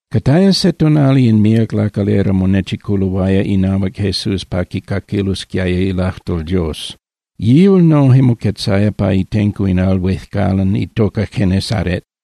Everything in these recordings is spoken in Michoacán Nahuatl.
Cataya se tonali in míac lacalera monechiculoaya inahuac Jesús pa quicaquilosquiaya ilajtol Dios. Yihual noje moquetzaya pa itenco in al huejcalan itoca Genesaret.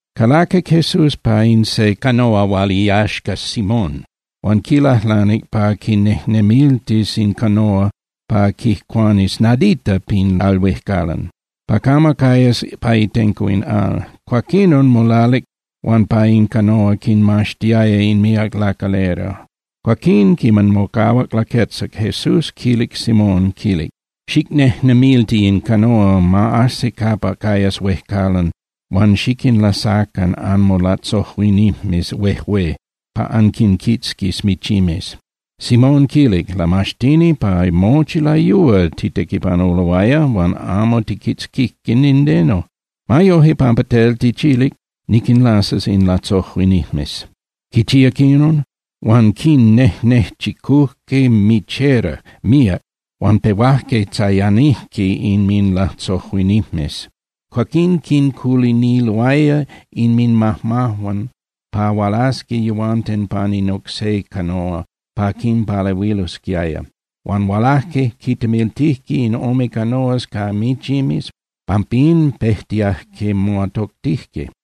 Calaquic Jesús pa in se canoa hual iyaxca Simón, huan quilajlanic pa quinejnemiltis in canoa pa quijcuanis nadita pin al huejcalan pa camo cayas pa itenco in al. Cuaquinon molalic huan pa in canoa quinmaxtiaya in míac lacalera. Cuaquín quiman mocahuac laquetzac, Jesús quilic Simón, quilic: —Xicnejnemilti in canoa, ma ajsi capa cayas huejcalan huan xiquinlasacan anmolatzojuinijmes huejué pa anquinquitzquis michimes. Simón quilic: —Lamaxtini, pa mochi layúa titequipanuloaya huan amo tijquitzquije nindeno. Ma yoje, pampa tel tichilic, niquinlasas in latzojuinijmes. Quichíac inon, huan quinnejnechicujque michera, míac, huan pehuajque tzayanijque inminlatzojuinijmes. Cuaquín quinculiniloaya inminmajmajuan pa hualasqui yehuanten pan in oc se canoa pa quinpalehuilosquiaya. Huan hualajque, quintemiltijque in ome canoas ca michimes, pampín pejtiajque moatoctijque.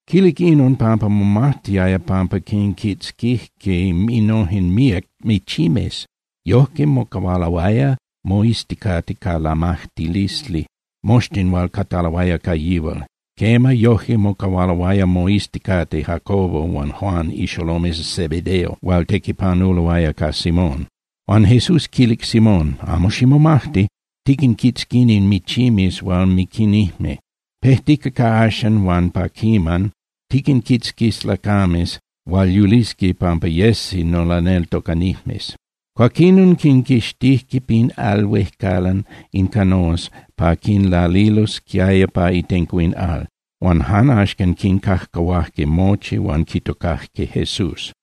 Quilic inon pampa momajtiaya pampa quinquitzquijque innojen míac michimes. Yojque mocahualoaya moizticate ca lamajtilisli moxtin hual cataloaya ca yihual. Quema, yoje mocahualoaya moizticate Jacobo huan Juan ixolomes Zebedeo, hual tequipanuloaya ca Simón. Huan Jesús quilic Simón: —Amo ximomajti. Tiquinquitzquini michimes hual miquinijme. Pejtica ca axcan huan pa quiman tiquinquitzquis lacames hual yulisqui pampa yesi nolaneltocanijmes. Cuaquinon quinquixtijque pin al huejcalan in canoas pa quinlalilosquiaya pa itenco in al, huan jan axcan quincajcahuajque mochi huan quitocajque Jesús.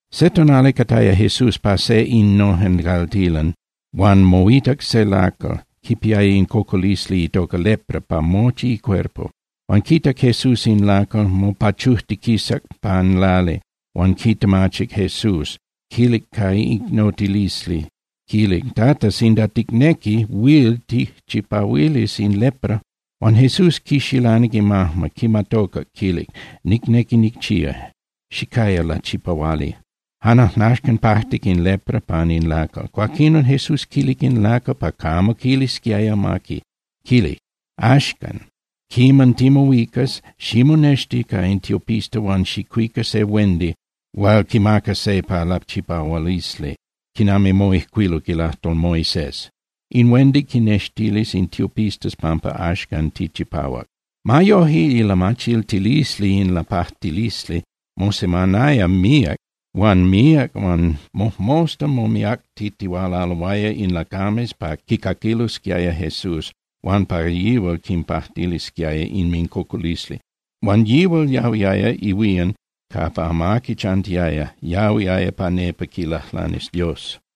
Se tonali cataya Jesús pa se innojen caltilan, huan moitac se lacal, quipiaya in cocolisli itoca lepra pa mochi icuerpo. Huan quitac Jesús in lacal, mopachujtiquisac pan lali, huan quitemachic Jesús, quilic ca icnotilisli, quilic: —Tata, sinda ticnequi, huil tijchipahuilis in lepra. Huan Jesús quixilanic imajma, quimatocac, quilic: —Nicnequi nicchía. Xicaya lachipahuali. Jan ajnaxcan pajtic in lepra pan in lacal. Cuaquinon Jesús quilic in lacal pa camo quilisquiaya amaqui, quilic: —Axcan quiman timohuicas, ximonexti ca in tiopista huan xicuica se huendi hual quimaca se pa lachipahualisli, quinami moijcuiluc ilajtol Moisés. In huendi quinnextilis in tiopistas pampa axcan tichipahuac. Ma yoje, ilamachiltilisli in lapajtilisli mosemanaya míac huan míac huan mojmosta momiactitihualaloaya in lacames pa quicaquilosquiaya Jesús huan pa yihual quinpajtilisquiaya inmincocolisli. Huan yihual yahuiaya ihuían capa amaqui chantiaya, yahuiaya pa nepa quilajlanis Dios.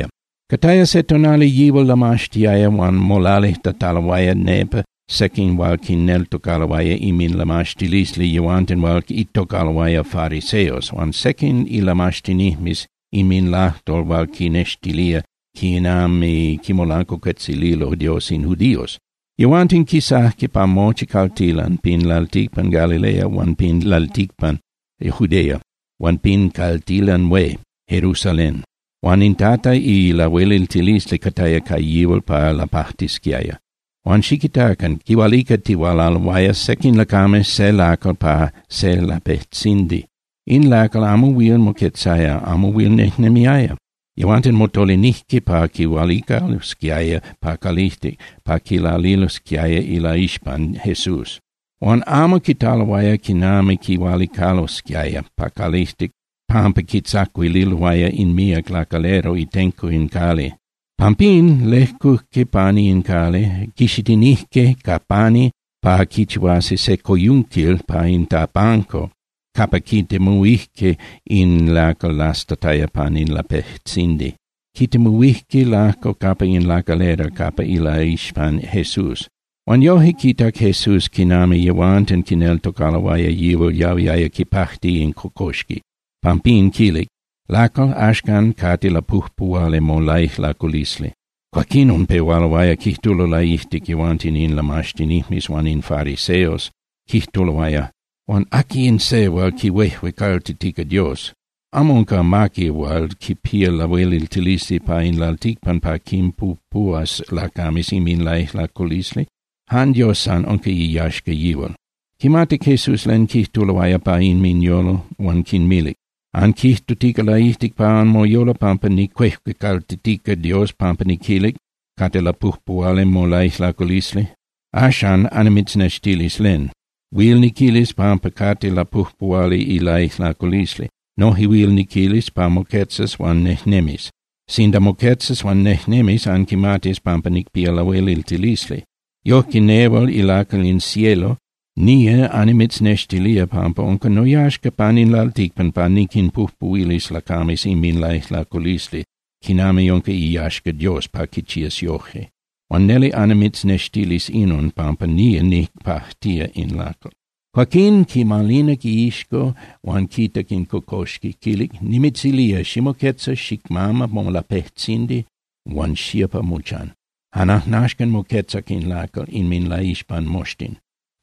Cataya se tonali yihual lamaxtiaya huan molalijtataloaya nepa sequin hual quineltocaloaya inminlamaxtilisli yehuanten hual itocaloaya fariseos, huan sequin ilamaxtinijmes inminlajtol hual quinextilía quinami quimolancuacuetzililo Dios in judíos. Yehuanten quisajque pa mochi caltilan pin lalticpan Galilea huan pin lalticpan Judea huan pin caltilan hué Jerusalén. Huan in Tata ilahueliltilisli cataya ca yihual pa lapajtisquiaya. Huan xiquitacan, quihualicatihualaloaya sequin lacames se lacal pan se lapejtzindi. In lacal amo huil moquetzaya, amo huil nejnemiaya. Yehuanten motolinijque pa quihualicalosquiaya pa calijtic pa quilalilosquiaya ilaixpan Jesús. Huan amo quitaloaya quinami quihualicalosquiaya pa calijtic pampa quintzacuililoaya in míac lacalera itenco in cali. Pampín, lejcujque pani in cali, quixitinijque ca pani pa quichihuasi se coyunquil pa in tapanco capa quitemuhuijque in lacal lastataya pan in lapejtzindi. Quitemuhuijque lajco capa in lacalera, capa ilaixpan Jesús. Huan yoje quitac Jesús quinami yehuanten quineltocaloaya yihual yahuiaya quipajti in cocoxqui. Pampín quilic: —Lacal, axcan cate lapujpuhuali molaijlaculisli. Cuaquinon pehualoaya quijtulo laijtic yehuanten in lamaxtinijmes huan in fariseos, quijtuloaya: “Huan ¿aqui in se hual quihuejuecaltitica Dios? Amo unca amaqui hual quipía lahueliltilisli pan in lalticpan pa quinpujpuhuas lacames inminlaijlaculisli. Jan Dios san, unca iyaxca yihual.” Quimatic Jesús len quijtuloaya pa inminyolo huan quinmilic: —Anquijtutica laijtic pa anmoyolo pampa nicuejuecaltitica Dios pampa niquilic: “Cate lapujpuhuali molaijlaculisli.” Axan, annimitznextilis len. Huil niquilis pampa cate lapujpuhuali ilaijlaculisli. Noje huil niquilis pa moquetzas huan nejnemis. Sinda moquetzas huan nejnemis anquimatis pampa nicpía lahueliltilisli. Yojque nehual ilacal in cielo nía annimitznextilía pampa unca noyaxca pan in lalticpan pa niquinpujpuhuilis lacames inminlaijlaculisli, quinami unca iyaxca Dios pa quichías yoje. Huan neli annimitznextilis inon, pampa nía nicpajtía in lacal. Cuaquín, quimalinac iixco huan quitac in cocoxqui, quilic: —Nimitzilía, ximoquetza, xicmama molapejtzindi huan xía pa mochan. Jan ajnaxcan moquetzac in lacal inminlaixpan moxtin,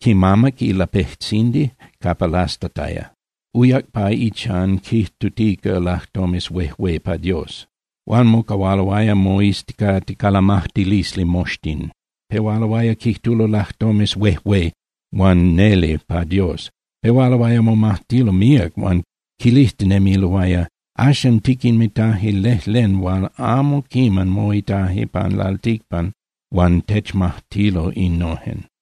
quimamac in lapejtzindi capa lastataya, uyac pa ichan quijtutica lajtomes huejué pa Dios. Huan mocahualoaya moizticate ca lamajtilisli moxtin. Pehualoaya quijtulo lajtomes huejué huan neli pa Dios. Pehualoaya momajtilo míac huan quilijtinemiloaya: —Axan tiquinmitaje lejlen hual amo quiman moitaje pan lalticpan huan techmajtilo innojen.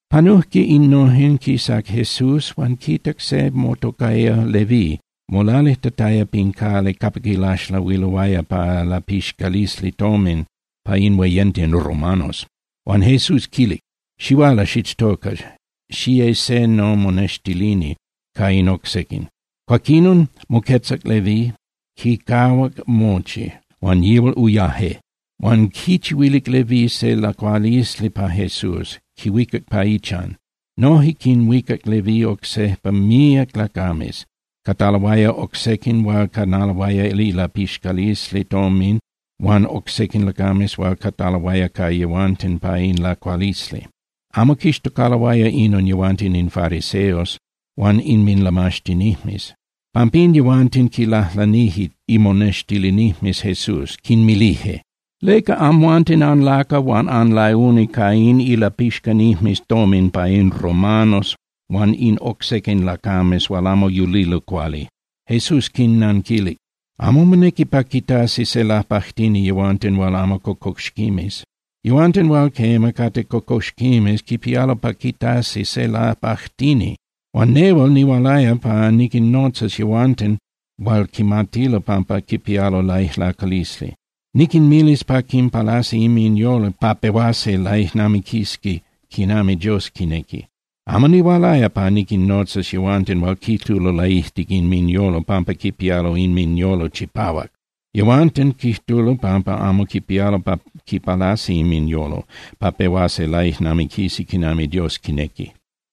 Panujque innojen, quisac Jesús huan quitac se motocaya Leví molalijtataya pin cali capa quilaxlahuiloaya pa ilapixcalisli tomin pa in hueyenten romanos. Huan Jesús quilic: —Xihuala xichtoca, xiye se nomonextilini ca in oc sequin. Cuaquinon moquetzac Leví, quincahuac mochi, huan yihual uyaje. Huan quichihuilic Leví se lacualisli pa Jesús, quihuicac pa ichan. Noje quinhuicac Leví oc sequin míac lacames, cataloaya oc sequin hual canaloaya ilapixcalisli tomin huan oc sequin lacames hual cataloaya ca yehuanten pa in lacualisli. Amo quixtocaloaya inon yehuanten in fariseos huan inminlamaxtinijmes. Pampín yehuanten quinlajlanije imonextilinijmes Jesús, quinmilije: —¿Leca amhuanten anlacua huan anlauni ca in ilapixcanijmes tomin pa in romanos huan in oc sequin lacames hual amo yulilo cuali? Jesús quinnanquilic: —Amo monequi pa quitasi se lapajtini yehuanten hual amo cocoxquimes. Yehuanten hual, quema, cate cocoxquimes quipialo pa quitasi se lapajtini. Huan nehual nihualaya pa niquinnotzas yehuanten hual quimatilo pampa quipialo laijlaculisli. Niquinmilis pa quinpalasi inminyolo pa pehuasi laijnamiquisqui quinami Dios quinequi. Amo nihualaya pa niquinnotzas yehuanten hual quijtulo laijtic inminyolo pampa quipialo inminyolo chipahuac. Yehuanten quijtulo pampa amo quipialo pa quipalasi inminyolo pa pehuasi laijnamiquisi quinami Dios quinequi.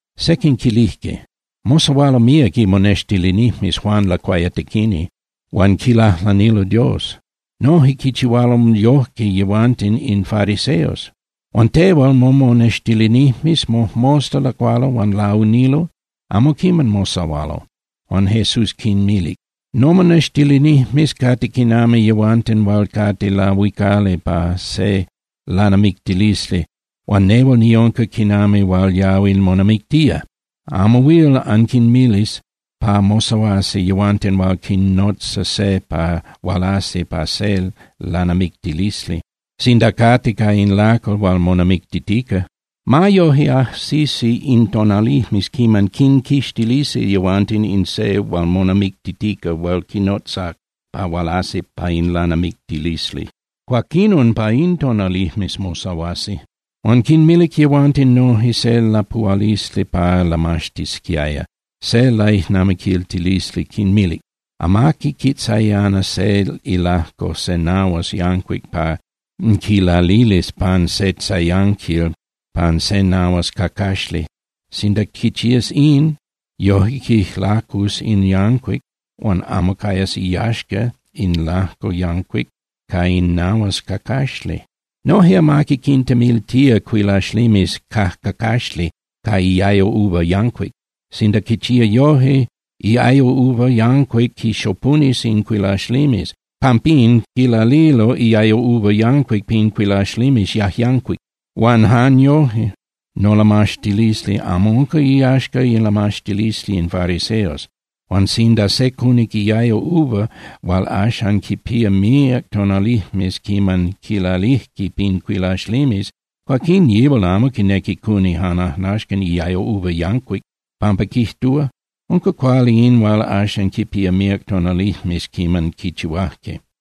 Sequin quilijque: —Mosahualo míac imonextilinijmes Juan Lacuayatequini huan quilajlanilo Dios. Noje quichihualo yojque yehuanten in fariseos. Huan tehual momonextilinijmes mojmosta lacualo huan launilo, amo quiman mosahualo. Huan Jesús quinmilic: —Nomonextilinijmes cate quinami yehuanten hual cate lahuicali pa se lanamictilisli huan nehual niunca quinami hual yahui monamictía. Amo huil anquinmilis pa mosahuasi yehuanten hual quinnotza se pa hualasi pa se lanamictilisli sinda cate ca in lacal hual monamictitica. Ma yoje, ajsisi in tonalijmes quiman quinquixtilisi yehuanten in se hual monamictitica hual quinnotzac pa hualasi pa in lanamictilisli. Cuaquinon pa in tonalijmes mosahuasi. Huan quinmilic yehuanten noje se lapuhualisli pa lamaxtisquiaya, se laijnamiquiltilisli, quinmilic: —Amaqui quitzayana se ilajco se nahuas yancuic pa quilalilis pan se tzayanquil pan se nahuas cacaxli. Sinda quichías in, yoje quijlacus in yancuic huan amo cayas iyaxca in lajco yancuic ca in nahuas cacaxli. Noje amaqui quintemiltía cuilaxlimes cajcacaxli ca iayo uva yancuic. Sinda quichía yoje, iayo uva yancuic quixopunis in cuilaxlimes. Pampín, quilalilo iayo uva yancuic pin cuilaxlimes yajyancuic. Huan jan yoje nolamaxtilisli amo unca iyaxca ilamaxtilisli in fariseos. Huan sinda se cunic iayo uva hual axan quipía míac tonalijmes quiman quilalijque pin cuilaxlimes, cuaquín yihual amo quinequi cuni jan ajnaxcan iayo uva yancuic, pampa quijtúa: “Unca cuali in hual axan quipía míac tonalijmes quiman quichihuajque.”